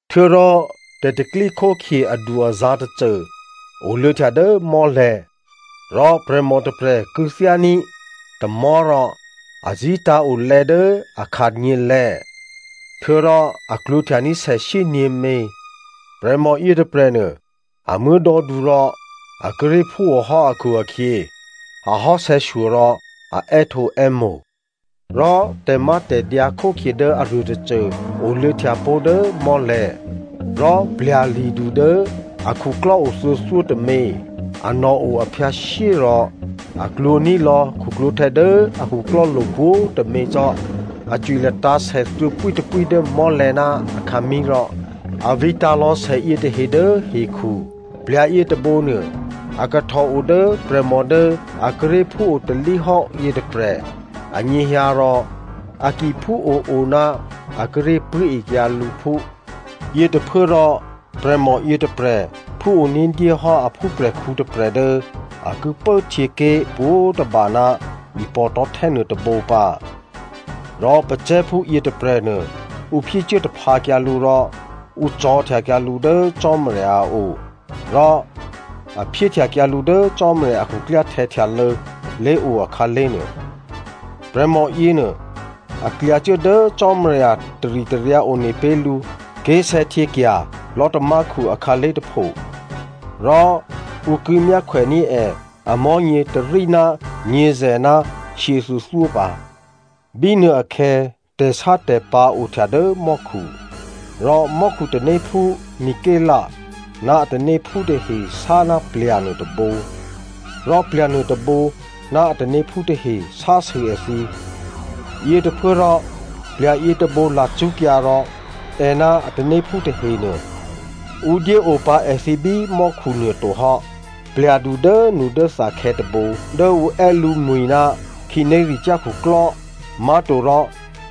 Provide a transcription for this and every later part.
Htuô̌rò tè̤ tè̤pro̤tè̤prya̤ adu-azǎ̤ tôcô oluô̌htya dố mò́lè̤̌. Rò prè̤mò tôprè̤ kû̌thyání̤ tamò̤́ rò a zí̤tǎ̤o lè̌ dố a khanyělè̤̌ htuô̌rò a klwǒ̤htyaní̤ sè shyényě̤mě. Prè̤mò yětôprè̤nuô a muố̤dò̌du rò a kíré̤ phúohò́ akhu-akhyě ahò́ sè̌shyo rò a è́htǒè́mo̤. Rò tè̤mátè̤dyǎ khókhye dố aruô tôcô oluô̌htya pó̤ dố mò́lè̤̌. Rò plya̤li̤du dố a khuklò́o thuô̌thyótômě, anò̤ o aphyǎshyé rò a klwǒ̤ní̤ lò̌ khuklwǒ̤htè̌ dố a khuklò́lo̤ pwǒ̤tômě cò́. A cwi latǎ̤ sè thuô̌pwítôpwí dố mò́lè̤̌ ná akhǎmí̤ rò a vǐtǎ̤ lò̌ sè yětahe dố hekhu. Plya̤ yětôbǒ nuô, a kahtòo dố prè̤mò dố a kíré̤ phúo talíhò́ yětôprè̤ anyěhyǎ rò a ki phúo-o ná a kíré̤ pṳ̂́ekyǎ lǔphú. Yětôphuốrò prè̤mò yětôprè̤ phúo ní̤dyé hò́ a phúprè̤khǔ tôprè̤ dố a ki pốhtyěké̤ pwǒ̤tôba ná ipò̤ tò̤́htè́ nuôtôbǒ pǎ. Rò pacè̤̌phú yětôprè̤nuô ǔ phyécuố taphǎkyǎ lǔ rò ǔ cò̤̌htyakyǎ lǔ dố Cò́marya a o rò a phyéhtyakyǎ lǔ dố Cò́marya a khuklyáhtè̌ htyalô̌ lé̤o akhǎlé̤ nuô. Prè̤mò yěnuô a klyacuố dố Cò́marya taritaryǎ one pé̤ lǔ ké̤sè̌htyěkya̤ lò̤́tamákhu akhǎlé̤ tôpho. Rò ǔ ki myákhwèní̤ è amò̤́nyě tôrí ná nyě̤zè̤ ná shyěthuô̌thyó pǎ. Bínuôakhè̌ tè̤sátè̤pǎ̤ ohtya dố mò́khu. Rò mò́khu tanéphú Mikelè ná a tanéphú tahe sá ná plya̤ nuôtôbǒ. Rò plya̤ nuôtôbǒ ná a tanéphú tahe sásû èthǐ. Yětôphuốrò plya̤ yětôbǒ lacṳ́kyǎ rò è ná a tanéphú tahenuô, ǔ dyé opǎ èthǐ bí mò́khu nuôto hò́. Plya̤du dốnudốthakhè̌ tôbǒ dố ǔ è́ lǔmwi̤ ná khǐnéricyá̤ khuklò́ má̤torò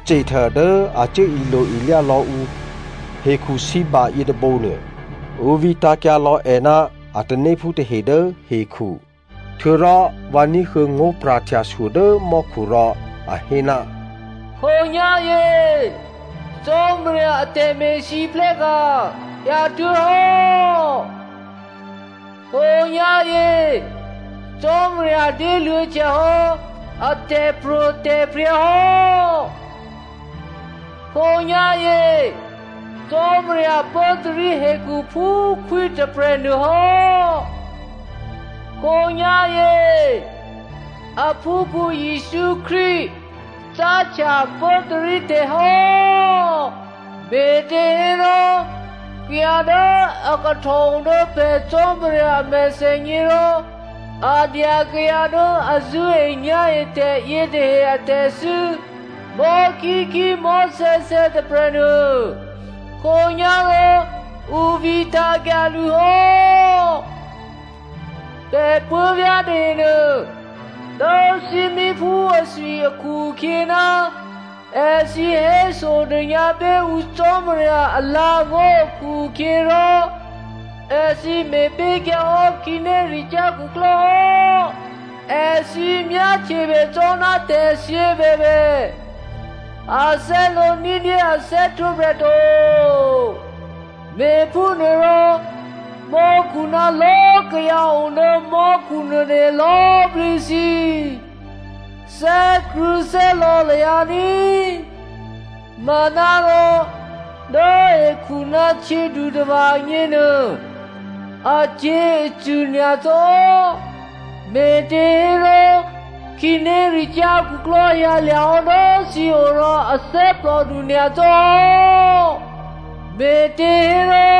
Satan dố a cuố ilo-ilyá lò̌ ǔ hekhusǐba yětôbǒ nuô, ǔ vǐtǎ̤kyǎ lò̌ è ná a tanéphú tahe dố hekhu. Htuô̌rò vǎ ní̤huô̌ ngó̤pra̤htyashyo dố mò́khu rò a hé, “Khǒnyá̤yě Cò́marya a tè̤me̤lwóhteka̤ hyǎtuố̤hò́. Khǒnyá̤yě Cò́marya dyéluô̌ htyahò́ a tè̤pro̤tè̤prya̤ hò́. Khǒnyá̤yě Cò́marya pốtarí hekhu phú khwí tôprè̤ nuôhò́. Khǒnyá̤yě aphúkhǔ Jesǔ Krístu cáhtya pốtarí tè̤hò́. Me̤těhérò kayǎ dố a kahtò o dố pè̤ Cò́marya a mèthènyě rò a dya kayǎ dố a zṳ̂́enyá̤etè̤ yětahe a tè̤thû́ mò̤́khíkhí, mò̤́sè̌sè̌ tôprè̤nuô, khǒnyá̤rò ǔ vǐtǎ̤kyǎ lǔ hò́. Pè̤ puố̤vyá̤ tahenuô, dố thímíphú athwi akhu-akhyě ná èthǐ hésodônyǎ pé̤ ǔ Cò́marya alǎ̤angó̤ akhu-akhyěrò, èthǐ me̤pé̤kyǎ hò́ khǐnéricyá̤ khuklò́ hò́. Èthǐ myáhtyebè cò́ ná tè̤thyě bèbè, a thè́lǒ ní̤dyé a thè́htwǒprè̤ to. Me̤phúnuôrò mò́khu ná lò̌꤮ kayǎ o dố mò́khu nuôtahe lò̌꤮ plǐ thǐ, thè́krṳ̂̌thè́lò̌ lahyǎ ní꤮, manárò dố hekhu ná htyědutava̤ agněnuô acyě̤acṳ̂ nyacò́. Me̤těhérò khǐnéricyá̤ khuklò́ hyǎlya̤hò́ dố thǐo rò a thè́plòdu nyacò́ hò́. Me̤těhérò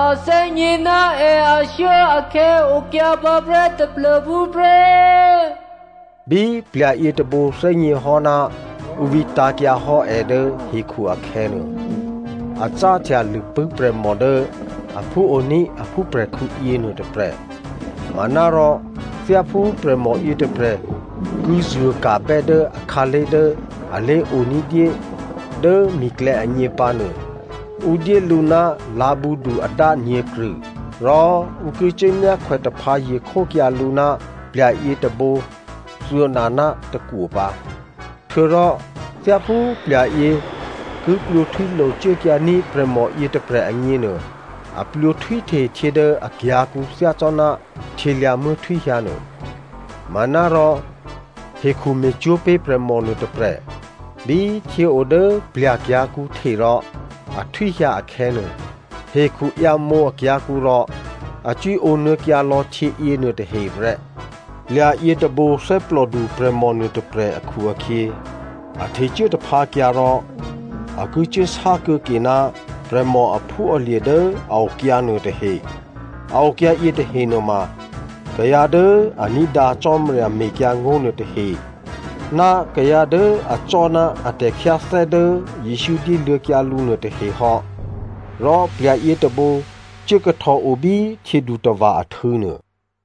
a thè́gně ná è ashuốakhè̌ okyǎ pǎprè́ taplô̤phú prè́.” Bí plya̤ yětôbǒ thè́gněhò́ ná ǔ vǐtǎ̤kyǎ hò́ è dố hekhu akhè̌nuô, a cáhtya lṳ̂pṳ̂́ prè̤mò dố aphúoní̤ a phúprè̤khǔ yěnuô tôprè̤. Manárò thyáphú prè̤mò yětôprè̤ ki zuô̤ka̤bè́ dố akhǎlé̤ dố alé̤o ní̤dyé dố mi̤klè̌ agně pǎnuô, ǔ dyé lǔ ná lǎ̤bǔdu adá nyě̤krṳ̂. Rò ǔ ki cuốmyákhwè taphǎye̤ khókyǎ lǔ ná plya̤ yětôbǒ thuô̌na ná tôkwo pǎ. Htuô̌rò thyáphú plya̤yě ki plwǒhtwílo cuốkyǎní̤ prè̤mòyě tôprè̤ agněnuô, a plwǒhtwíhte htyě dố akyǎ̤kǔ thyácò́ná htyělyǎ̤muố̤ htwíhyǎ nuô. Manárò hekhu me̤cwó̤ pé̤ prè̤mò nuôtôprè̤. Bí htyěo dố plya̤ kyǎ̤kǔ hte rò a htwíhyǎ akhè̌nuô, hekhu ǎyǎmǒ akyǎ̤kǔ rò a cwíǒ nuô̌kyǎ lò̌ htyěyěnuô tahe prè́. Plya̤ yětôbǒ thè́plòdu prè̤mò nuôtôprè̤ akhu-akhyě, a htecuố taphǎkyǎ rò a ki cuốsá kuô̌ke ná prè̤mò aphúalye̤ dố a okyǎ nuôtahe. A okyǎ yětahe nuôma kayǎ dố a ní̤dǎ Cò́marya mekyǎngó̤ nuôtahe ná kayǎ dố acò́ ná a tè̤khyáthè́ dố Jesǔ dyéluô̌kyǎ lǔ nuôtahe hò́. Rò plya̤ yětôbǒ cuố kahtòo bí htyědutava̤ ahtû̌ nuô.